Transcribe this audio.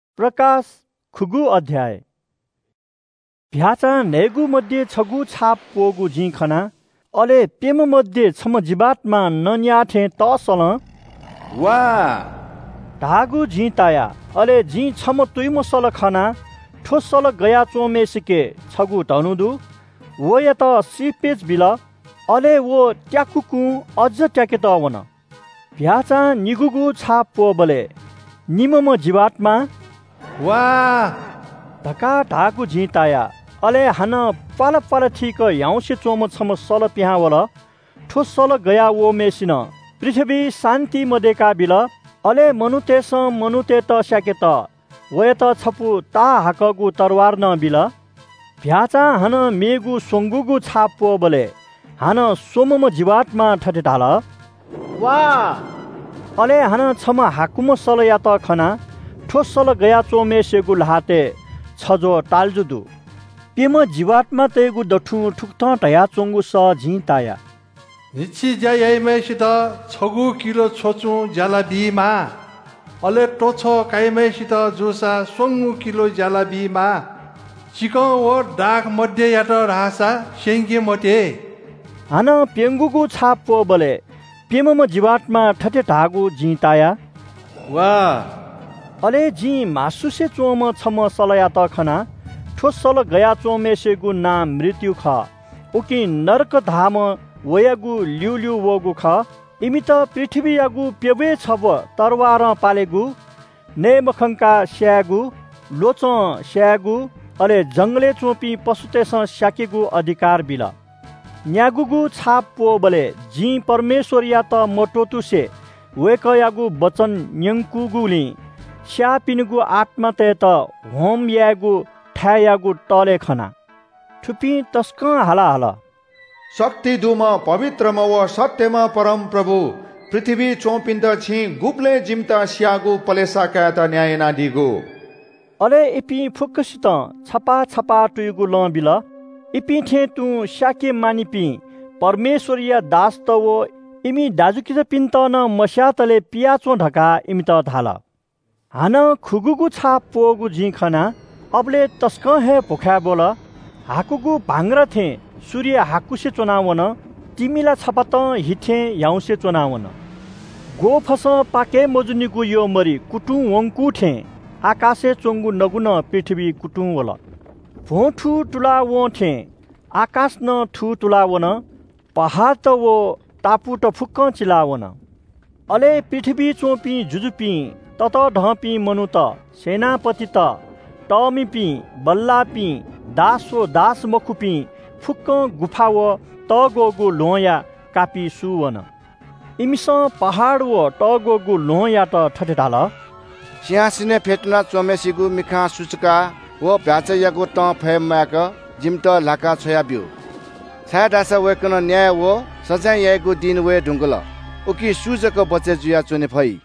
चीधिकःम्‍ह भ्‍याःचां न्‍हय्‌गू मध्‍ये छगू छाप प्‍वःगु जिं खना। अले प्‍यम्‍ह मध्‍ये छम्‍ह जीवात्‍मां नँ न्‍याः थें तःसलं “वा” धाःगु जिं ताया। अले जिं छम्‍ह तुयुम्‍ह सल खना। थ्‍व सल गया च्‍वंम्‍हय्‌सिके छगू धनु दु। वयात श्रीपेच बिल। अले व त्‍याकुकुं अझ त्‍याकेत वन। चीधिकःम्‍ह भ्‍याःचां निगूगु छाप प्‍वःबलय् निम्‍हम्‍ह जीवात्‍मां “वा” धकाः धाःगु जिं ताया। अले हानं प्‍वालाप्‍वाला थीक ह्याउँसे च्‍वंम्‍ह छम्‍ह सल पिहां वल। थ्‍व सल गया वःम्‍हय्‌सिनं पृथ्‍वीइ शान्‍ति मदयेका बिल। अले मनूतय्‌सं मनूतय्‌त स्‍याकेत वयात छपु ताहाकःगु तरवार नं बिल। चीधिकःम्‍ह भ्‍याःचां हानं मेगु स्‍वंगूगु छाप प्‍वःबलय् हानं स्‍वम्‍हम्‍ह जीवात्‍मां थथे धाल – “वा।” अले हानं छम्‍ह हाकुम्‍ह सलयात खना। थ्‍व सल गया च्‍वंम्‍हय्‌सिगु ल्‍हातय् छज्‍वः ताल्‍जु दु। प्‍यम्‍ह जीवात्‍मातय्‌गु दथुं थुकथं धयाहःगु सः जिं ताया – “न्‍हिच्‍छि ज्‍या याइम्‍हय्‌सित छगू किलो छ्वचुं ज्‍यालाबीमाः। अले तछ्व काइम्‍हय्‌सित जूसा स्‍वंगू किलो ज्‍यालाबीमाः। चिकं व दाखमद्ययात धाःसा स्‍यंके मते।” हानं प्‍यंगूगु छाप प्‍वःबलय् प्‍यम्‍हम्‍ह जीवात्‍मां थथे धाःगु जिं ताया – “वा।” अले जिं म्‍हासुसे च्‍वंम्‍ह छम्‍ह सलयात खना। थ्‍व सल गया च्‍वंम्‍हय्‌सिगु नां मृत्‍यु खः। उकिं नरक धाःम्‍ह वयागु ल्‍यूल्‍यू वःगु खः। इमित पृथ्‍वीयागु प्‍यब्‍वय् छब्‍व तरवारं पालेगु, नये मखंकाः स्‍यायेगु, ल्‍वचं स्‍यायेगु, अले जंगलय् च्‍वंपिं पशुतय्‌सं स्‍याकेगु अधिकार बिल। न्‍यागूगु छाप प्‍वःबलय् जिं परमेश्‍वरयात मत्‍वःतुसे वय्‌कःयागु वचन न्‍यंकूगुलिं स्‍याःपिनिगु आत्‍मातय्‌त होम यायेगु थाय्‌यागु तःले खना। थुपिं तसकं हाला हल – “शक्ति दुम्‍ह, पवित्रम्‍ह व सत्‍यम्‍ह परमप्रभु, पृथ्‍वीइ च्‍वंपिन्‍त छिं गुबलय् जिमित स्‍याःगु पलेसा कायेत न्‍याय यानादीगु?” अले इपिं फुक्‍कसितं छपाः छपाः तुयुगु लं बिल। इपिं थें तुं स्‍याके मानिपिं परमेश्‍वरया दासत व इमि दाजुकिजापिन्‍त नं मस्‍यातले पियाच्‍वँ धकाः इमित धाल। हानं खुगूगु छाप प्‍वःगु जिं खना। अबलय् तसकं हे भ्‍वखाय् ब्‍वल। हाकुगु भांग्रा थें सूर्य हाकुसे च्‍वना वन। तिमिला छपातं हि थें ह्याउँसे च्‍वना वन। ग्‍वःफसं पाकय् मजूनिगु यःमरि कुतुं वंकु थें आकाशय् च्‍वंगु नगु नं पृथ्‍वीइ कुतुंवल। भ्‍वंथू तुला वं थें आकाश नं थूतुला वन। पहाडत व टापुत फुक्‍कं चिला वन। अले पृथ्‍वीइ च्‍वंपिं जुजुपिं, ततःधंपिं मनूत, सेनापतित, तःमिपिं, बल्‍लाःपिं, दास व दासमखुपिं, फुक्‍कं गुफा व तःग्‍वःगु ल्‍वहंया कापिचाय्‌ सुचूवन। इमिसं पहाड व तःग्‍वःगु ल्‍वहंयात थथे धाल – “सिंहासनय् फ्‍यतुना च्‍वंम्‍हय्‌सिगु मिखां सुचुकाः व चीधिकःम्‍ह भ्‍याःचायागु तं फये म्‍वायेक जिमित ल्‍हाका छ्वयाब्‍यु। छाय्‌धाःसा वय्‌कलं न्‍याय व सजाँय याइगु दिं वये धुंकल, उकिं सु जक बचय् जुयाः च्‍वने फइ?”